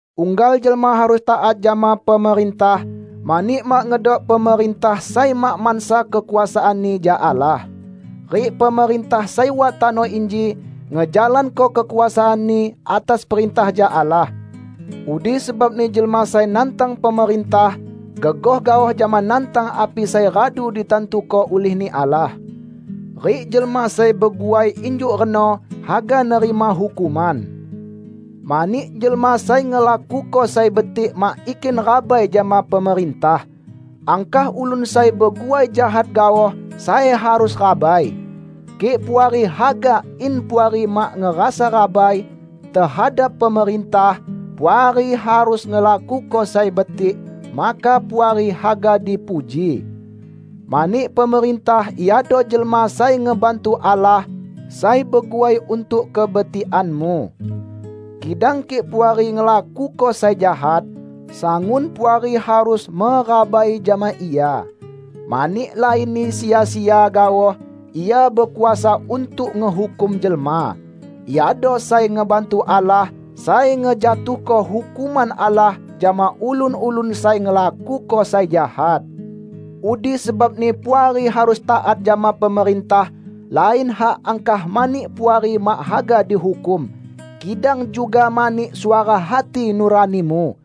Unggal jelma harus taat jama pemerintah, mani mak ngedok pemerintah sai mak mansa kekuasaanni jak Allah. Rik pemerintah sai wat tano inji, ngejalanko kekuasaanni atas perintah jak Allah. Udi sebabni jelma sai nantang pemerintah gegoh gaoh jama nantang api sai radu ditantuko ulih-Ni Allah. Rik jelma sai beguai injuk reno haga nerima hukuman. Mani, jelma sai ngelakuko sai betik mak ikin rabai jama pemerintah. Angkah ulun sai beguai jahat gaoh sai harus rabai. Kik Puari haga in Puari mak ngerasa rabai tehadap pemerintah, Puari harus ngelakuko sai betik, maka Puari haga dipuji. Mani pemerintah iado jelma sai ngebantu Allah sai beguai untuk kebetikanmu. Kidang kik Puari ngelakuko sai jahat, sangun Puari harus merabai jama ia, mani lainni sia-sia gaoh ia bekuasa untuk ngehukum jelma. Iado sai ngebantu Allah, sai ngejatuhko hukuman Allah jama ulun-ulun sai ngelakuko sai jahat. Udi sebabni Puari harus taat jama pemerintah -- lain hak angkah mani Puari mak haga dihukum, kidang juga mani suara hati nuranimu.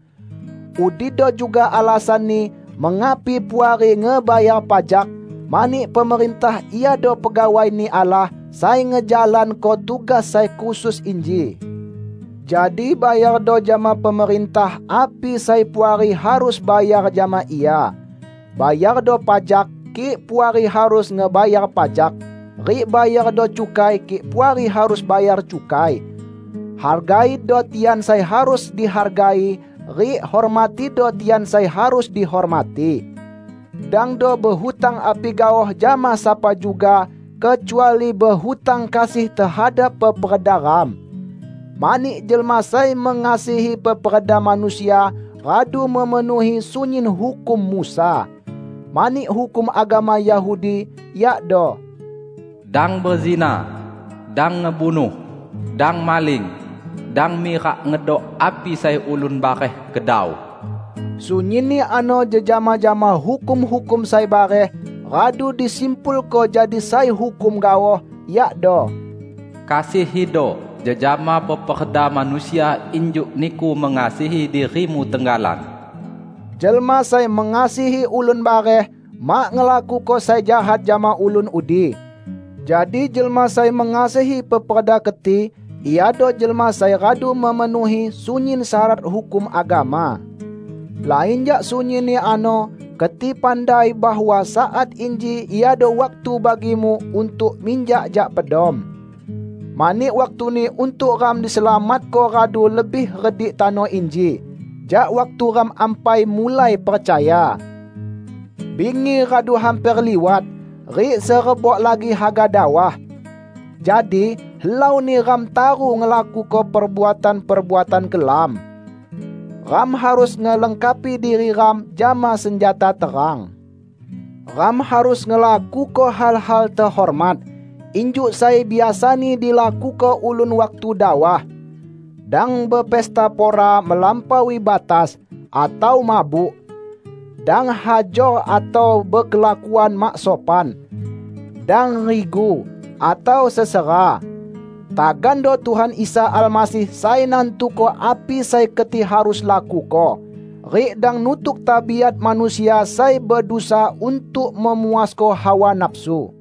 Udido juga alasanni mengapi Puari ngebayar pajak, mani pemerintah iado pegawai-Ni Allah sai ngejalanko tugas sai khusus inji. Jadi bayardo jama pemerintah api sai Puari harus bayar jama ia. Bayardo pajak, kik Puari harus ngebayar pajak; rik bayardo cukai kik Puari harus bayar cukai. Hargaido tian sai harus dihargai rik hormatido tian sai harus dihormati. Dangdo behutang api gaoh jama sapa juga, kecuali behutang kasih tehadap peperda ram. Mani jelma sai mengasihi peperda manusia, radu memenuhi sunyin hukum Musa. Mani hukum agama Yahudi, yakdo: Dang bezinah, dang ngebunuh, dang maling, dang mirak ngedok api sai ulun bareh kedau; sunyinni ano jejama jama hukum-hukum sai bareh, radu disimpulko jadi sai hukum gaoh, yakdo, "Kasihido jejama peperda manusia injuk niku mengasihi dirimu tenggalan." Jelma sai mengasihi ulun bareh, mak ngelakuko sai jahat jama ulun udi. Jadi jelma sai mengasihi peperda keti iado jelma sai radu memenuhi sunyin syarat hukum agama. Lain jak sunyinni ano keti pandai bahwa saat inji iado waktu bagimu untuk minjak jak pedom. Mani waktuni untuk ram diselamatko radu lebih redik tano inji jak waktu ram ampai mulai percaya. Bingi radu hamper liwat; rik serebok lagi haga dawah. Jadi, helauni ram taru ngelakuko perbuatan-perbuatan kelam. Ram harus ngelengkapi diri ram jama senjata terang. Ram harus ngelakuko hal-hal tehormat injuk sai biasani dilakuko ulun waktu dawah; dang bepesta pora melampaui batas, atau mabuk. Dang hajor atau bekelakuan mak sopan. Dang rigu, atau sesera. Tagando Tuhan Isa Almasih sai nantuko api sai keti harus lakuko. Rik dang nutuk tabiat manusia sai bedusa untuk memuasko hawa nafsu.